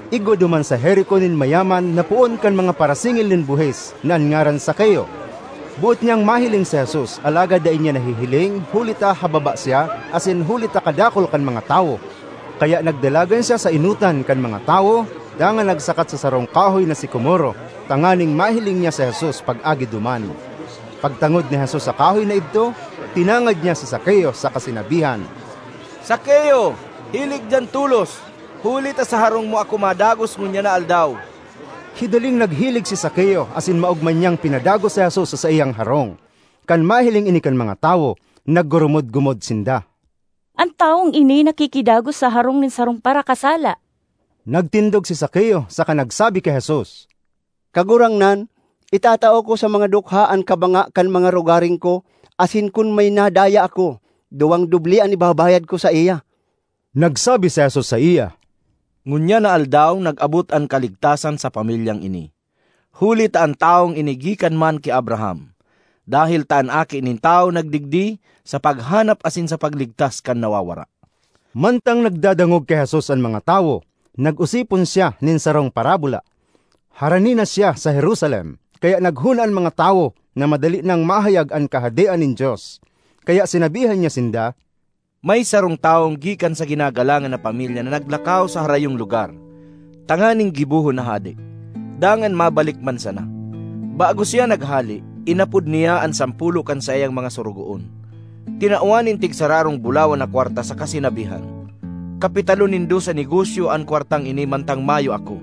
Igwa duman sa Jerico nin mayaman na poon kan mga parasingil nin buhis na an ngaran Zakeo. Boot niyang mahiling si Jesus alagad dai niya nahihiling huli ta hababa siya asin huli ta kadakul kan mga tawo. Kaya nagdalagan siya sa enotan kan mga tawo dangan nagsakat sa sarong kahoy na sikomoro tanganing mahiling niya si Jesus pag-agi duman. Pagtangod ni Jesus sa kahoy na idto, tinangad niya si Zakeo saka sinabihan, “Zakeo, hilig diyan tolos, huli ta sa harong mo ako madagos ngunyan na aldaw.” Hidaling naghilig si Zakeo asin maogma niyang pinadagos si Jesus sa saiyang harong. Kan mahiling ini kan mga tawo, naggurumod-gumod sinda, “An tawong ini nakikidagos sa harong nin sarong parakasala.” Nagtindog si Zakeo saka nagsabi ki Jesus, “Kagurangnan, itatao ko sa mga dukha an kabanga kan mga rogaring ko asin kun may nadaya ako, duwang doble an ibabayad ko saiya.” Nagsabi si Jesus saiya, “Ngunyan na aldaw nag-abot an kaligtasan sa pamilyang ini, huli ta an tawong ini gikan man ki Abraham. Dahel ta an Aki nin Tawo nagdigdi sa paghanap asin sa pagligtas kan nawawara.” Mantang nagdadangog ki Jesus an mga tawo, nag-osipon siya nin sarong parabola. Harani na siya sa Jerusalem, kaya naghona an mga tawo na madali nang mahayag an Kahadean nin Dios. Kaya sinabihan niya sinda, “May sarong tawong gikan sa ginagalangan na pamilya na naglakaw sa harayong lugar tanganing gibohon na hade, dangan mabalik man sana. Bago siya naghale, inapod niya an sampolo kan saiyang mga sorogoon, tinawan nin tigsararong bulawan na kwarta saka sinabihan, ‘Kapitalon nindo sa negosyo an kwartang ini mantang mayo ako.’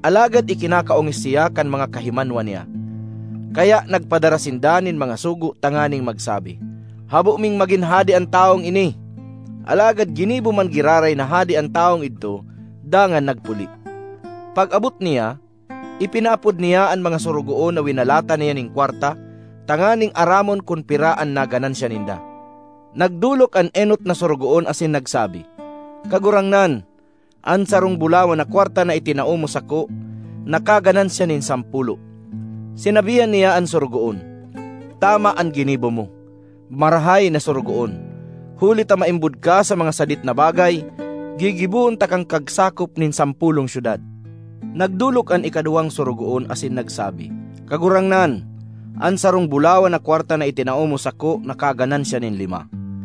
Alagad ikinakaongis siya kan mga kahimanwa niya, kaya nagpadara sinda nin mga sugo tanganing magsabi, ‘Habo ming magin hade an tawong ini.’ ”Alagad ginibo man giraray na hade an tawong idto dangan nagpuli. Pag-abot niya, ipinaapod niya an mga sorogoon na winalatan niya nin kwarta tanganing aramon kun pira an naganansya ninda. Nagdolok an enot na sorogoon asin nagsabi, ‘Kagurangnan, an sarong bulawan na kwarta na itinao mo sako nakaganansya nin sampolo.’ Sinabihan niya an sorogoon, ‘Tama an ginibo mo, marahay na sorogoon! Huli ta maimbod ka sa mga sadit na bagay, gigibohon takang kagsakop nin sampolong syudad.’ Nagdolok an ikaduwang sorogoon asin nagsabi, ‘Kagurangnan, an sarong bulawan na kwarta na itinao mo sako nakaganansya nin lima.’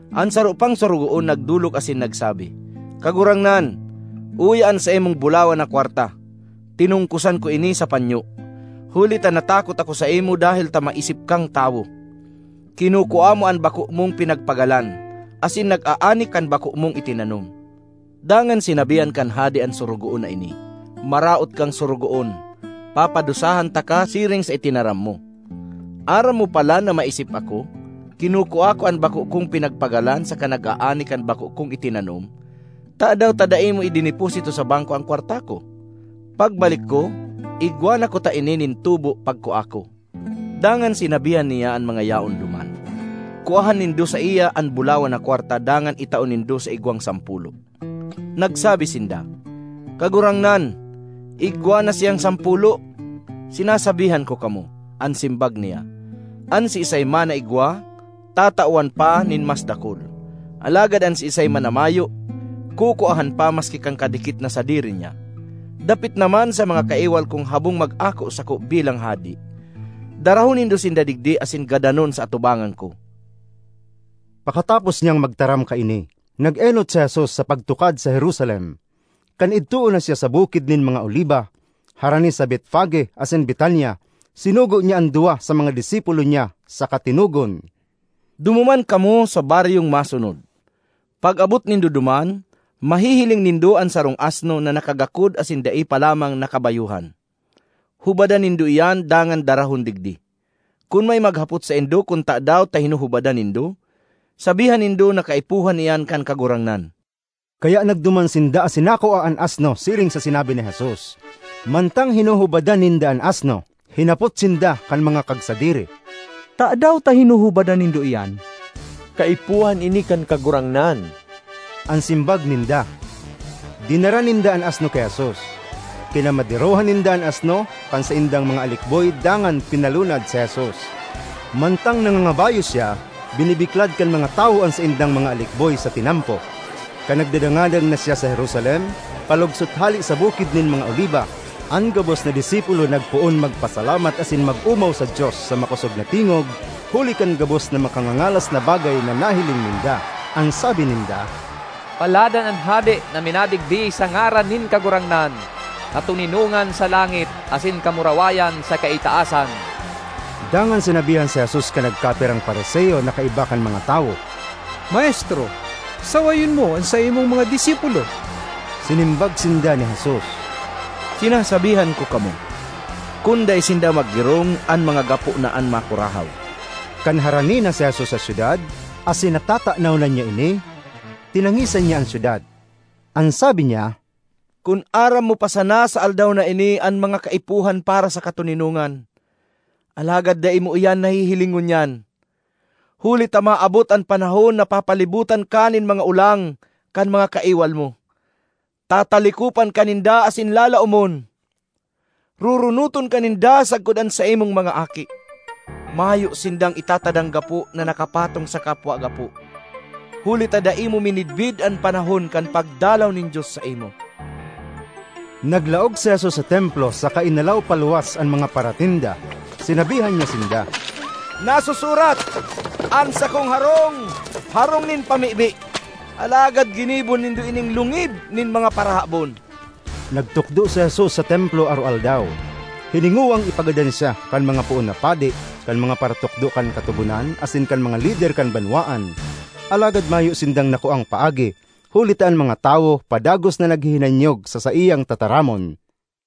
An saro pang sorogoon nagdolok asin nagsabi, ‘Kagurangnan, uya an saimong bulawan na kwarta; tinungkosan ko ini sa panyo; huli ta natakot ako saimo dahel ta maisip kang tawo. Kinukua mo an bako mong pinagpagalan, asin nag-aani kan bako mong itinanom.’ Dangan sinabihan kan hade an sorogoon na ini, ‘Maraot kang sorogoon! Papadusahan taka siring sa itinaram mo! Aram mo palan na maisip ako, kinukua ko an bako kong pinagpagalan saka nag-aani kan bako kong itinanom; tadaw ta dai mo idineposito sa bangko an kwarta ko? Pagbalik ko, igwa na kuta ini nin tubo pagkua ko.’ Dangan sinabihan niya an mga yaon duman, ‘Kuaha nindo saiya an bulawan na kwarta dangan itao nindo sa igwang sampolo.’ Nagsabi sinda, ‘Kagurangnan, igwa na siyang sampolo!’ ‘Sinasabihan ko kamo,’ an simbag niya, ‘an siisay man na igwa, tatawan pa nin mas dakul; alagad an siisay man na mayo, kukuahan pa maski kan kadikit na sadiri niya. Dapit naman sa mga kaiwal kong habong mag-ako sako bilang hade, darahon nindo sinda digdi asin gadanon sa atubangan ko!’” Pakatapos niyang magtaram kaini, nag-enot si Jesus sa pagtukad sa Jerusalem. Kan idtoon na siya sa Bukid nin mga Oliba, harani sa Betfage asin Betania, sinugo niya an duwa sa mga disipulo niya saka tinugon, “Dumuman kamo sa baryong masunod. Pag-abot nindo duman, mahihiling nindo an sarong asno na nakagakod asin dai pa lamang nakabayohan. Hubadan nindo iyan dangan darahon digdi. Kun may maghapot saindo kun tadaw ta hinuhubadan nindo, sabihan nindo na kaipuhan iyan kan Kagurangnan.” Kaya nagduman sinda asin nakua an asno siring sa sinabi ni Jesus. Mantang hinuhubadan ninda an asno, hinapot sinda kan mga kagsadiri, “Tadaw ta hinihubadan (hinuhubadan) nindo iyan?” ”Kaipuhan ini kan Kagurangnan,” an simbag ninda. Dinara ninda an asno ki Jesus; kinamaderohan ninda an asno kan saindang mga alikboy dangan pinalunad si Jesus. Mantang nangangabayo siya, binibiklad kan mga tawo an saindang mga alikboy sa tinampo. Kan nagdadangadang na siya sa Jerusalem—palugsot hale sa Bukid nin mga Oliba—an gabos na disipulo nagpoon magpasalamat asin mag-omaw sa Dios sa makosog na tingog huli kan gabos na makangangalas na bagay na nahiling ninda. An sabi ninda, ”Paladan an Hade na minadigdi sa ngaran nin Kagurangnan! Katoninongan sa langit, asin kamurawayan sa kaitaasan!” Dangan sinabihan si Jesus kan nagkapirang Fariseo na kaiba kan mga tawo, “Maestro, sawayon mo an saimong mga disipulo!” Sinimbag sinda ni Jesus, “Sinasabihan ko kamo, kun dai sinda maggirong, an mga gapo na an makurahaw.” Kan harani na si Jesus sa syudad, asin natatanaw na niya ini, tinangisan niya an syudad. An sabi niya, “Kun aram mo pa sana sa aldaw na ini an mga kaipuhan para sa katoninongan! Alagad dai mo iyan nahihiling ngunyan! Huli ta maabot an panahon na papalibotan ka nin mga olang kan mga kaiwal mo, tatalikopan ka ninda asin lalaomon. Roronoton ka ninda sagkod an saimong mga aki; mayo sindang itatadang gapo na nakapatong sa kapwa gapo, huli ta dai mo minidbid an panahon kan pagdalaw nin Dios saimo!” Naglaog si Jesus sa Templo saka inalaw paluwas an mga paratinda. Sinabihan niya sinda, “Nasusurat: ‘An sakong harong, harong nin pamibi.’ Alagad ginibo nindo ining lungib nin mga parahabon!” Nagtukdo si Jesus sa Templo aroaldaw. Hiningowang ipagadan siya kan mga poon na padi, kan mga paratukdo kan Katogonan asin kan mga lider kan banwaan. Alagad mayo sindang nakuang paagi, huli ta an mga tawo padagos na naghihinanyog sa saiyang tataramon.